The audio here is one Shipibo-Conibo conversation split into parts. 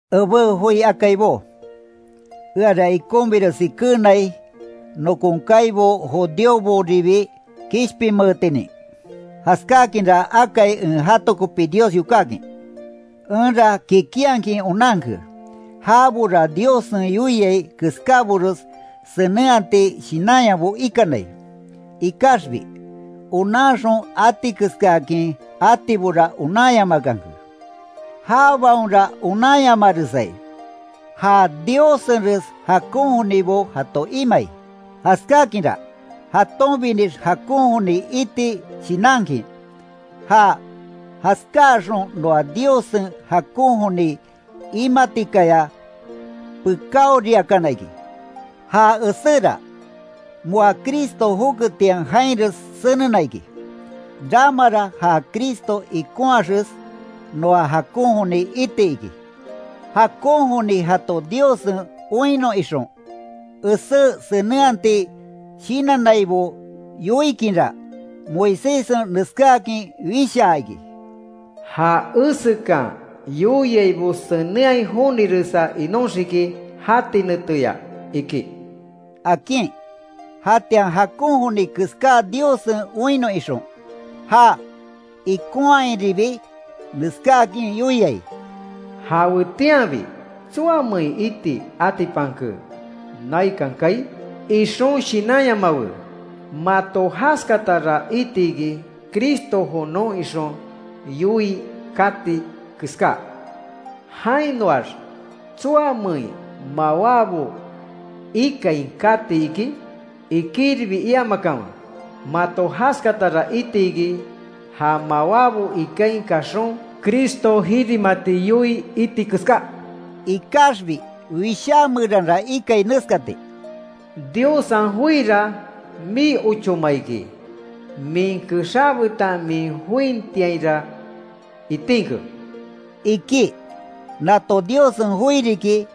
Ebé joi akaibó, eara ikonbiresi keenai, nokon kaibo judíoboribi kishpinmeetinin, jaskákinra akai en jato kopi Dios yokákin. Enra kikinhakin onanke, jabora Diossen yoiai keskábores senenhati shinanyabo ikanai. Ikaxbi, onanxon atikeskaakin atibora onanyamakanke. Jabaonra onanyamaresai, ja Diossenres jakon jonibo jato imai. Jaskákinra, jatonbinix jakon joni iti shinankin, ja jaskáaxon noa Diossen jakon joni imatikaya, pekáoriakana iki. Ja eséra, moa Cristo joketian jainres senena iki, ramara ja Cristo ikonhaxes, noa jakon joni iti iki. Jakon joni jato Diossen oinnon ixon, esé senenhati shinannaibo yoikinra, Moiséssen neskáakin wishaa iki: “Ja esekan yoiaibo senenhai joniresa inóxiki jati neteya iki”, akin. Jatian jakon joni keska Diossen oinnon ixon; já ikonhairibi neskáakin yoiai: “Jawetianbi ¿Tsoamein iti atipanke naikan kaai? Ixon shinanyamawe. Mato jaskatara itiki: Cristo jonon ixon yoii kati keska. Jainoax, ¿Tsoamein mawábo ikain katiki?” Ikiribi iamakanwe. Mato jaskatara itiki, ja mawábo ikain kaxon, Cristo jirimati yoii iti keska. Ikaxbi Wishá meranra ikai neskati: “Diossen joira mii ochóma iki, min kexá betan min jointiainra itinke”, iki. Nato Diossen joi riki,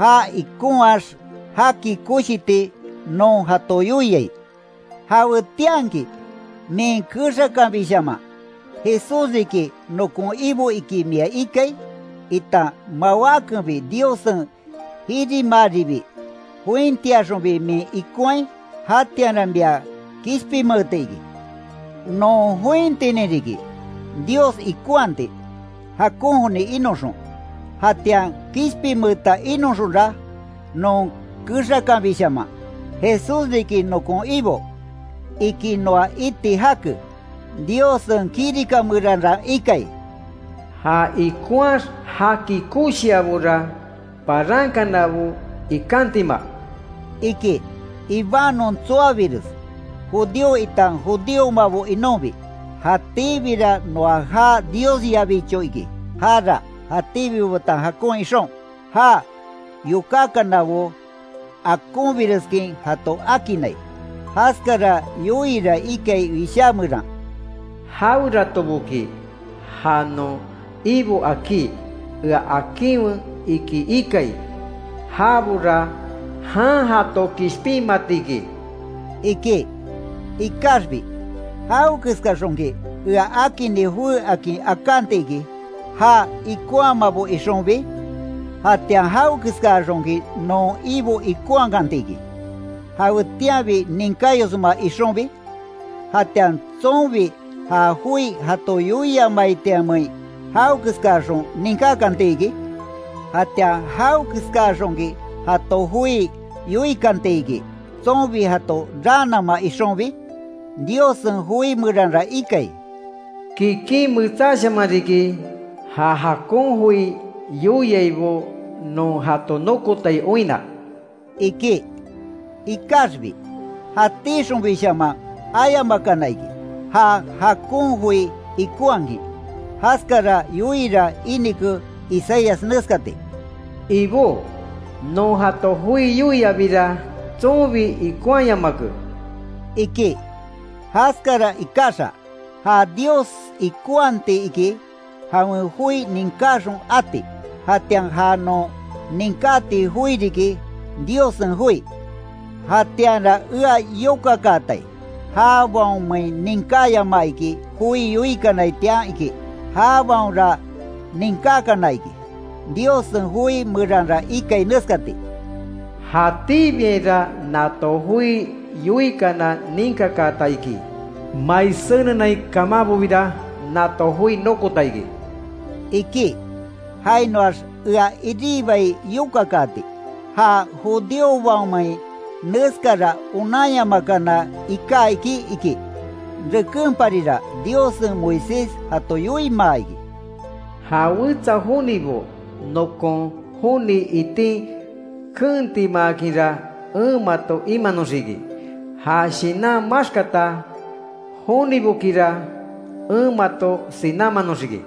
ja ikonhaax jaki koshiti non jato yoiai. Jawetianki min kexakanbishaman, Jesús riki nokon Ibo iki mia ikai, itan mawákenbi Diossen jirimaaribi, jointiaxonbi min ikonhai, jatianra mia kishpinmeeti iki. Non jointinin riki, Dios ikonhati jakon joni inoxon. Jatian kishpinmeeta inoxonra, non kexakanbishaman, Jesús riki nokon Ibo, iki noa iti jake. Diossen kirika meranra ikai: “Ja ikonhaax jaki koshiabora, parankanabo ikantima”, iki. Ibanon tsoabires, judío itan judíomabo inonbi, jatíbira noa ja Diosyabicho iki. Jara jatíbibo betan jakon ixon, já yokákanabo akonbireskin jato akinnai. Jaskara yoiira ikai Wishá meran: “Jaweratoboki ja non Ibo akí, ea akinwe, iki ikai, jabora jan jato kishpinmatiki”, iki. Ikaxbi ¿Jawekeskaxonki, ea akinni jowé akin akanti iki, já ikonhamabo ixonbi? ¿Jatian jawekeskaxonki non Ibo ikonhakantiki, jawetianbi ninkáyosma ixonbi? ¿Jatian tsonbi ja joi jato yoiamaitianmein, jawekeskaxon ninkákanti iki? ¿Jatian, jawekeskaa xonki jato joi yoikantiki, tsonbi jato raanama ixonbi? Diossen joi meranra ikai: “kikin metsáshaman riki, ja jakon joi yoiaibo, non jato nokotai oinna”, iki. Ikaxbi, jatixonbishaman ayamakana iki, ja jakon joi ikonhakin. Jaskara yoiira inike Isaías neskati: “Ibó, non jato joi yoiabira, tsonbi ikonhayamake”, iki. Jaskara ikaxa, ja Dios ikonhati iki, jawen joi ninkáxon ati, jatian ja non ninkáti joi riki, Diossen joi. Jatianra ea yokakaatai: ¿Jabaonmein ninkáyamaa iki, joi yoikanaitian? iki. Jabaonra ninkákana iki. Diossen joi meranra ikai neskati: “Jatíbiainra nato joi yoikana ninkakaata iki. Mai senenain kamanbobira nato joi nokota iki”, iki. Jainoax ea iribai yokakaati: ¿Ja judíobaonmein neskara onanyamakana iká iki? iki. Rekenparira Diossen Moisés jato yoimaa iki: “Ja wetsa jonibo nokon joni itin keentimaakinra, en mato imanoxiki, ja shinan maxkata jonibokira, en mato sinámanoxiki”,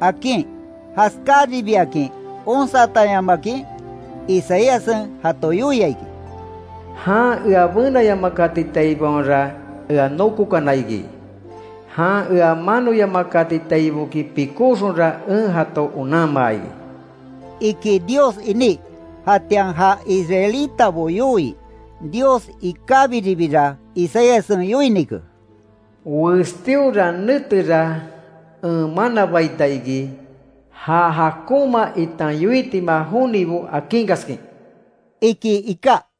akin. Jaskáribiakin onsatanyamakin, Isaíassen jato yoia iki: “Jan ea benayamakatitaibaonra, ea nokokana iki, jan ea manoyamakatitaiboki pikoxonra, en jato onanmaa iki”, iki Dios iní. Jatian ja Israelitabo yoii, Dios ikábiribira Isaíassen yoinike: “Westíora netera en manabaita iki, ja jakonma itan yoitima jonibo akinkaskin”, iki iká.